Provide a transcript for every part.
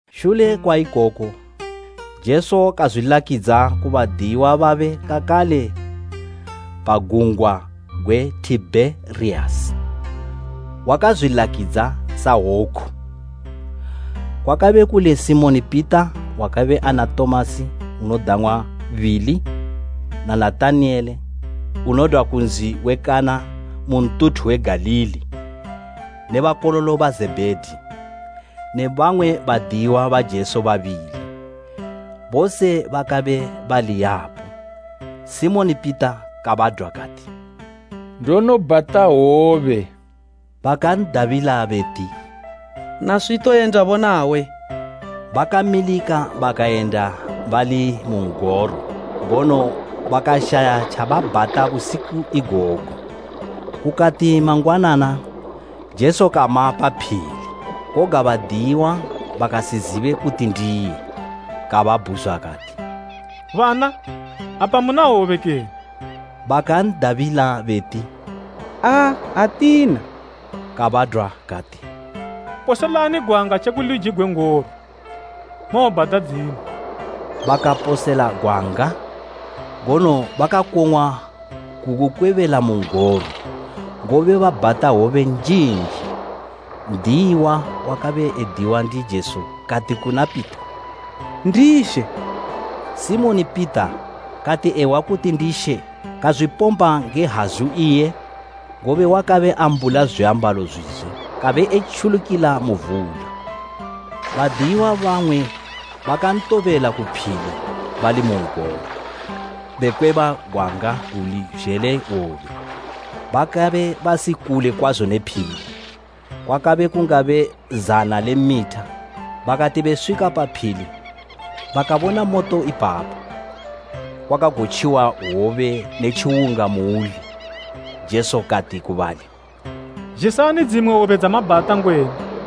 Shule kwa ikoku, Jesu kazwilakidza ku badiyiwa babe kakale pa gungwa gwe Tibheriyasi. Wakazwilakidza sa woku: Kwakabe kuli, Simoni Pita wakabe ana Tomasi unodang'wa Bili na Natanaele unodwa ku nzi we Kana mu ntuthu we Galili ne bakololo ba Zebhedi ne bamwe badiyiwa ba Jesu babili; bose bakabe bali yapo. Simoni Pita kabadwa kati, “Ndonobhata hwobe.” Bakan'dabila beti, “Naswi toyendabo nawe.” Bakamilika bakayenda bali mu n'goro, ngono bakashaya tjababhata busiku igogo. Kukati mangwanana, Jesu kama pa phili, koga badiyiwa bakasizibe kuti ndiye. Kababhuzwa kati, “Bana, apa muna hwobe kene?” Bakan'dabila beti, “Aa, atina.” Kabadwa kati, “Poselani gwanga tjeku luji gwe n'goro, mowobhata dzimwe.” Bakaposela gwanga ngono bakakong'wa kugukwebela mu n'goro, ngobe babhata hwobe njinji. N'diyiwa wakabe ediwa ndi Jesu kati kuna Pita, “Ndi She!” Simoni Pita kati ehwa kuti ndi She kazwipomba nge hazu iye, ngobe wakabe ambula zwiambalo zwizwe, kabe etjulukila mu vula. Badiyiwa bamwe bakantobela ku phili bali mu n'goro, bekweba gwanga guli zhele hwobe. Bakabe basi kule kwazo ne phili, kwakabe kungabe zana le mitha. Bakati beswika pa phili, bakabona moto ipapo, kwakagotjiwa hwobe ne tjiwunga muuli. Jesu kati ku bali, “Zhisani dzimwe hwobe dzamabhata ngwenu.”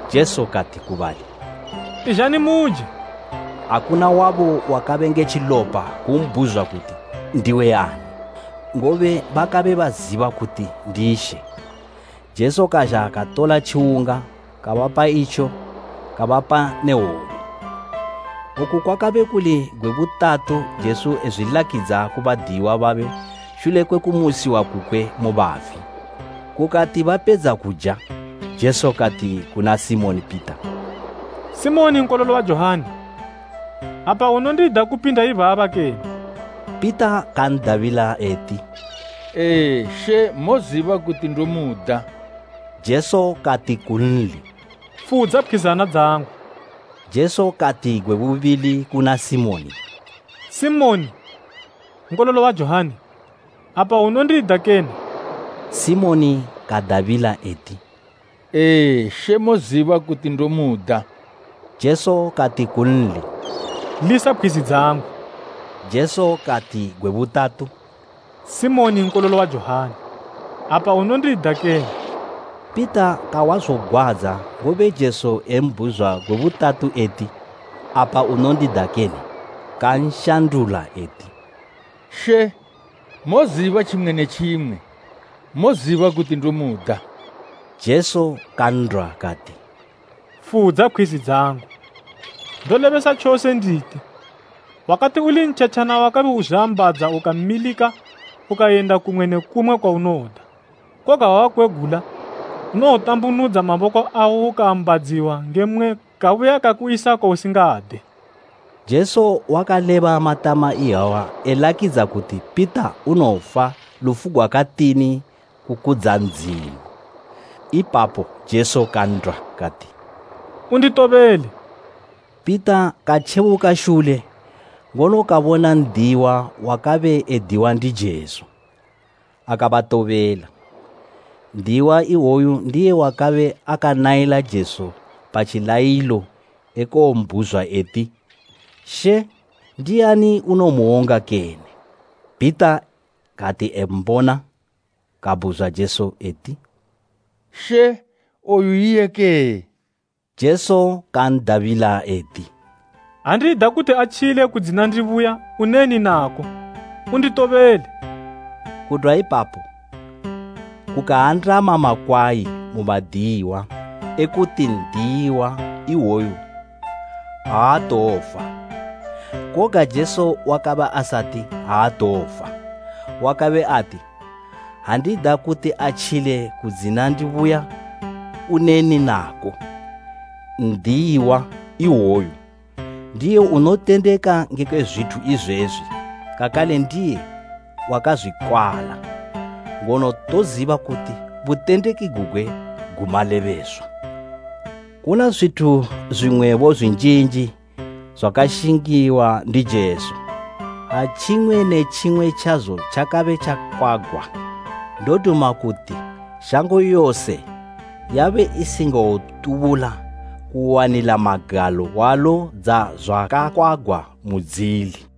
Jesu kati ku bali, “Izhani muje!” Akuna wabo wakabe nge tjilopa kumbhuzwa kuti, “Ndiwe ani?” ngobe bakabe baziba kuti ndi She. Jesu kazha katola tjiwunga, kabapa itjo, kabapa ne hwobe. Oku kwakabe kuli gwe butatu Jesu ezwilakidza ku badiyiwa babe shule kwe kumusiwa kukwe mu bafi. Kukati bapedza kuja, Jesu kati kuna Simoni Pita, “Simoni nkololo wa Johani, apa unondida kupinda ibaba kene?” Pita kan'dabila eti, “Ee, She, moziba kuti ndomuda.” Jesu kati kunli, “Fudza pkhwizana dzangu.” Jesu kati gwe bubili kuna Simoni, “Simoni, Nkololo wa Johani, apa unondida kene?” Simoni kadabila eti, “Ee, She, moziba kuti ndomuda.” Jesu kati kunli “Lisa pkhwizi dzangu.” Jesu kati gwe butatu, “Simoni nkololo wa Johani, apa unondida kene?” Pita kahwa zogwadza, ngobe Jesu embhuzwa gwe butatu eti, “Apa unondida kene?” Kanshandula eti, “She, moziba tjimwe ne tjimwe. Moziba kuti ndomuda!” Jesu kan'dwa kati, “Fudza pkhwizi dzangu. Ndolebesa tjose nditi, wakati uli ntjetjana wakabe uzwiambadza ukamilika ukayenda kumwe ne kumwe kwaunoda, koga ha wakwegula, unowotambunudza maboko awo ukaambadziwa nge mmwe kabuya kakuyisa kwausingade.” Jesu wakaleba matama iyawa elakidza kuti Pita unowofa lufu gwakatini kukudza Ndzimu. Ipapo Jesu kan'dwa kati, “Unditobele!” Pita katjebuka shule, ngono kabona n'diyiwa wakabe ediwa ndi Jesu akabatobela; n'diyiwa iwoyo ndiye wakabe akanayila Jesu pa tjilayilo ekowombhuzwa eti, “She, ndiani unowomuwonga kene?” Pita kati embona, kabhuzwa Jesu eti, “She, oyu iye kee?” Jesu kan'dabila eti, “Ha ndida kuti atjile kudzina ndibuya, uneni nako? Unditobele!” Kudwa ipapo kukaandama makwayi mu badiyiwa ekuti n'diyiwa iwoyo aatowofa. Koga Jesu wakabe asati, “Aatowofa.” Wakabe ati, “Ha ndida kuti atjile kudzina ndibuya, uneni nako?” N'diyiwa iwoyo ndiye unotendeka ngekwe zwithu izwezwi kakale ndiye wakazwikwala, ngono toziba kuti butendeki gugwe gu malebeswa. Kuna zwithu zwimwebo zwinjinji zwakashingiwa ndi Jesu. Ha tjimwe ne tjimwe tjazo tjakabe tjakwagwa, ndoduma kuti shango yose yabe isingawotubula kuwanila magalo hwalo dzazwakakwagwa mudzili.